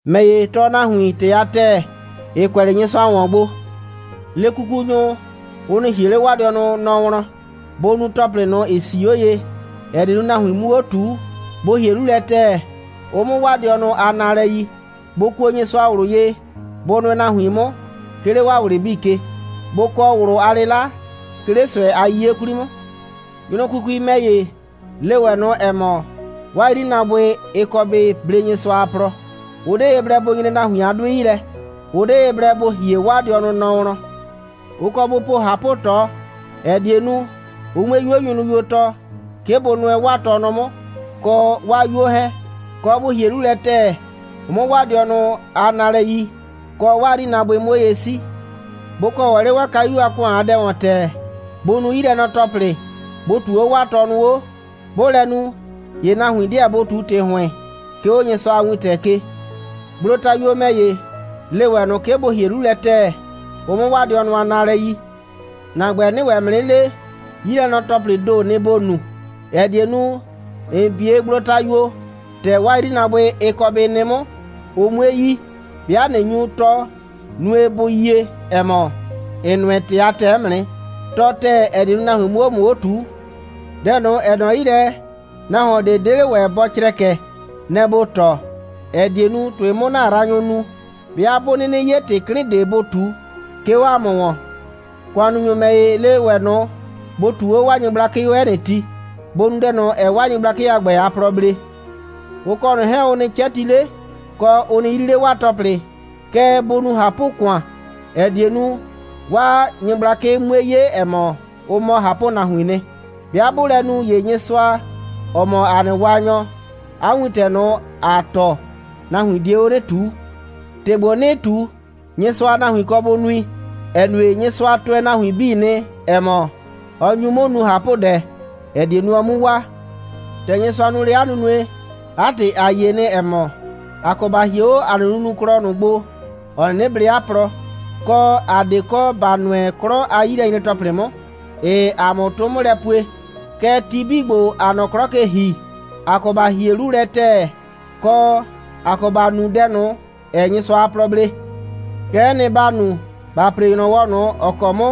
‑Mɛ ‑ye, tɔɔ nahuin ‑tɩ a ‑tɛɛ, ‑ɩ kʋɛ 'le Nyɩsʋa ‑wɔn gbo. Le kukunyʋ, ʋ nɩ ‑hie 'le 'waa dɩɔnʋ nɔ wlɔn. Bʋ nu ‑tɔplɩ ꞊nʋ, ‑ɩ 'sii 'o ye, ‑ɛ die nu, nahuin 'mu 'o ꞊tuu. Bʋ ‑hie 'lu lɛ ‑tɛɛ, ʋ 'mʋ 'waa dɩɔnʋ a naalɛ yi. Bʋ kuo Nyɩsʋa ꞊wlʋ ye. Bʋ nʋɛ nahuin 'mʋ, 'ke 'le 'waa ꞊wlɩ 'bii ke. Bʋ kɔ ꞊wlʋ a 'lɩla, 'ke 'le ꞊sʋɛ a 'yiye 'kwli 'mʋ. Nyrʋkukui ‑mɛ ‑ye, le ‑wɛ ꞊nʋ, ‑ɛ mɔ, 'waa 'yrinaabʋɩ, ɩ kɔ bɩ blee Nyɩsʋa a plɔ. Ʋ 'de ye blɛ bʋ nyre nahuin a 'dʋɩ 'yi lɛ. Ʋ 'de ye blɛ bʋ ‑hie 'waa dɩɔnʋ nɔ wlɔn. Ʋ kɔ bʋ po ꞊hapʋ꞊tɔ, ‑ɛ die nu, ʋ 'mue 'yuo nyrʋyuo tɔɔ, 'ke bʋ nʋɛ 'waa tɔnʋ 'mʋ, kɔ 'waa 'yuo 'hɛɛn, kɔ, bʋ ‑hie 'lu lɛ ‑tɛɛ, ʋ 'mʋ 'waa dɩɔnʋ a naalɛ yi, kɔ, 'waa 'yrinaabʋɩ 'mʋ 'o ye 'sii. Bʋ kɔ 'le 'waa kayu a ‑kʋan a dɛ ‑wɔn ‑tɛɛ. Bʋ nu 'yilɛnɔ‑tɔplɩ. Bʋ ꞊tuu 'o 'waa tɔnʋ 'o. 'Bʋʋ lɛ nu, ‑ye nahuin 'deɛ bʋ ꞊tu ‑tɩ ‑hʋɩn, 'ke 'o Nyɩsʋa a wintɛ ke. Gblotayuo ‑mɛ ‑ye, le ‑wɛ ꞊nʋ, 'ke bʋ ‑hie 'lu lɛ ‑tɛɛ, ʋ 'mʋ 'waa dɩɔnʋ a naalɛ yi. ‑Na ‑gbɛ, 'nɩɩ ‑wɛ ‑mʋ 'nɩ le, 'yilɛnɔ‑tɔplɩɩ ‑do, nɩ‑ ‑bo nu, ‑ɛ die nu, ‑n 'bie gblotayuo, ‑tɛ 'waa 'yrinaabʋɩ, ɩ kɔ bɩ nɩ 'mʋ, ʋ 'mue yi. 'Bɩa ꞊nɩ nyu tɔɔ, nue, bʋ yie, ‑ɛ mɔ, ‑n nʋɛ ‑tɩ a ‑tɛɛ 'mʋ nɩ. Tɔɔ ‑tɛɛ, ‑ɛ die nu, nahuin 'mʋ 'o ‑mʋ 'o ꞊tuu. Dɛ ꞊nʋ, ‑ɛ nɔ 'yi lɛ, nahuon ꞊de 'de 'le ‑wɛ bɔ crɛkɛ, nɛ‑ ‑bo tɔɔ, ‑ɛ die nu, ‑tʋɩ 'mʋ ‑na yraanyʋ nu, 'bɩa 'bʋ 'nɩnɩ 'ye ‑tɩ 'klɩn ꞊de bʋ ꞊tu, 'ke 'o ‑a mʋ ‑wɔn. ‑Kʋannunyʋ ‑mɛ ‑ye, le ‑wɛ ꞊nʋ, bʋ ꞊tuu 'o 'waa nyɩgblakɩ 'o 'ɛ nɩ ti. Bʋ nu dɛ ꞊nʋ, ‑ɛɛ 'waa nyɩgblakɩ a ‑gbɛ a plɔ blee. Ʋ kɔ ꞊nʋ 'hɛɛn, ʋ nɩ 'cɛti 'le, kɔ, ʋ nɩ 'yri 'le 'waa ‑tɔplɩ. Kɛɛ, bʋ nu ꞊hapʋ‑kʋan, ‑ɛ die nu, 'waa nyɩgblakɩ 'mue 'ye, ‑ɛ mɔ, ʋ mɔ ꞊hapʋnahuiin nɩ. 'Bɩa 'bʋʋ lɛ nu, ‑ye Nyɩsʋa, ‑ɔ mɔ ‑a nɩ Waanyɔ, 'a wintɛ ꞊nʋ, ‑aa tɔɔ, nahuin die 'o 'nɩ ꞊tuu. ‑Tɩ ‑gbo, 'nɩɩ ꞊tu, Nyɩsʋa a nahuin kɔ bʋ nui, ‑ɛ nue, Nyɩsʋa tʋɛ nahuin 'bii nɩ, ‑ɛ mɔ, ɔ nyu 'mʋ nu ꞊hapʋdɛ, ‑ɛ die nu, ɔ 'mu waa. ‑Tɛ Nyɩsʋa nu lɛ 'a nunue, 'a ‑tɩ, ‑a yie nɩ, ‑ɛ mɔ, ‑a kɔ ‑ba hie 'o ‑a nɩ nunuklɔ ꞊nʋ gbo, ‑ɔ 'nɩnɩ blee 'a plɔ, kɔ, ‑a 'de kɔ ‑ba nʋɛ 'klɔ a 'yilɛnyre‑tɔplɩ 'mʋ, ‑ɩɩ ‑a mʋ 'tʋ 'mʋ lɛ pue. Kɛɛ, ti 'bii ‑gbo, ‑aa nɔ 'klɔ ke ‑hi, ‑a kɔ ‑ba ‑hie 'lu lɛ ‑tɛɛ, kɔ, ‑a kɔ ‑ba nu dɛ ꞊nʋ, ‑ɛɛ Nyɩsʋa a plɔ blee. Kɛ'ɛ nɩ, ‑ba nu, ‑ba ‑pre ‑nyrɔwɔ ꞊nʋ, ‑ɔ kɔ 'mʋ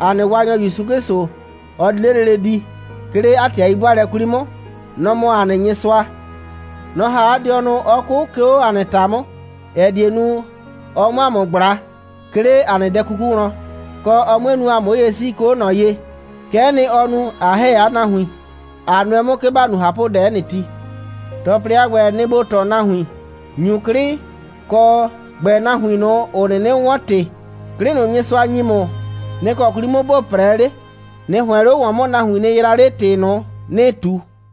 ‑a nɩ Waanyɔ ‑Yusu 'Klɩsʋ, ɔ di 'le lele di, 'ke 'le 'a ‑tɩ a 'yi'bʋaalɛ 'kwli 'mʋ. Nɔ‑ mɔ ‑a nɩ Nyɩsʋa. Nɔ‑ ‑ha 'a dɩɔnʋ, 'ɔ 'kʋ, 'ke 'o ‑a nɩ ‑ta 'mʋ, ‑ɛ die nu, ɔ 'mʋ ‑a mʋ ꞊gbla, 'ke 'le ‑a nɩ dɛ 'kuku wlɔn, kɔ, ɔ 'mue nu, ‑a 'mʋ 'o ye 'sii, 'ke 'o ꞊nɔ ye. Kɛ'ɛ nɩ, ɔ nu, ꞊a ‑hɛ 'a nahuin, ꞊a nʋɛ 'mʋ, 'ke ‑ba nu ꞊hapʋdɛ 'ɛ nɩ ti. ‑Tɔplɩ a ‑gbɛ, nɩ‑ ‑bo tɔɔ nahuin, ‑nyu 'klɩ, kɔ, ‑gbɛɛ nahuin ꞊nʋ, ‑ʋ 'nɩnɩ 'wɔn ‑tɩ. 'Klɩ ꞊nʋ, Nyɩsʋa ‑nyi ‑mʋ, nɩ‑ kɔ 'kwli 'mʋ ‑bo 'prɛɛ 'le. ꞊Nɩ ‑hʋɛn 'le ‑wɔn 'mʋ, nahuin nɩ yraa 'le ‑tɩ ꞊nʋ, ‑nɩɩ ꞊tu.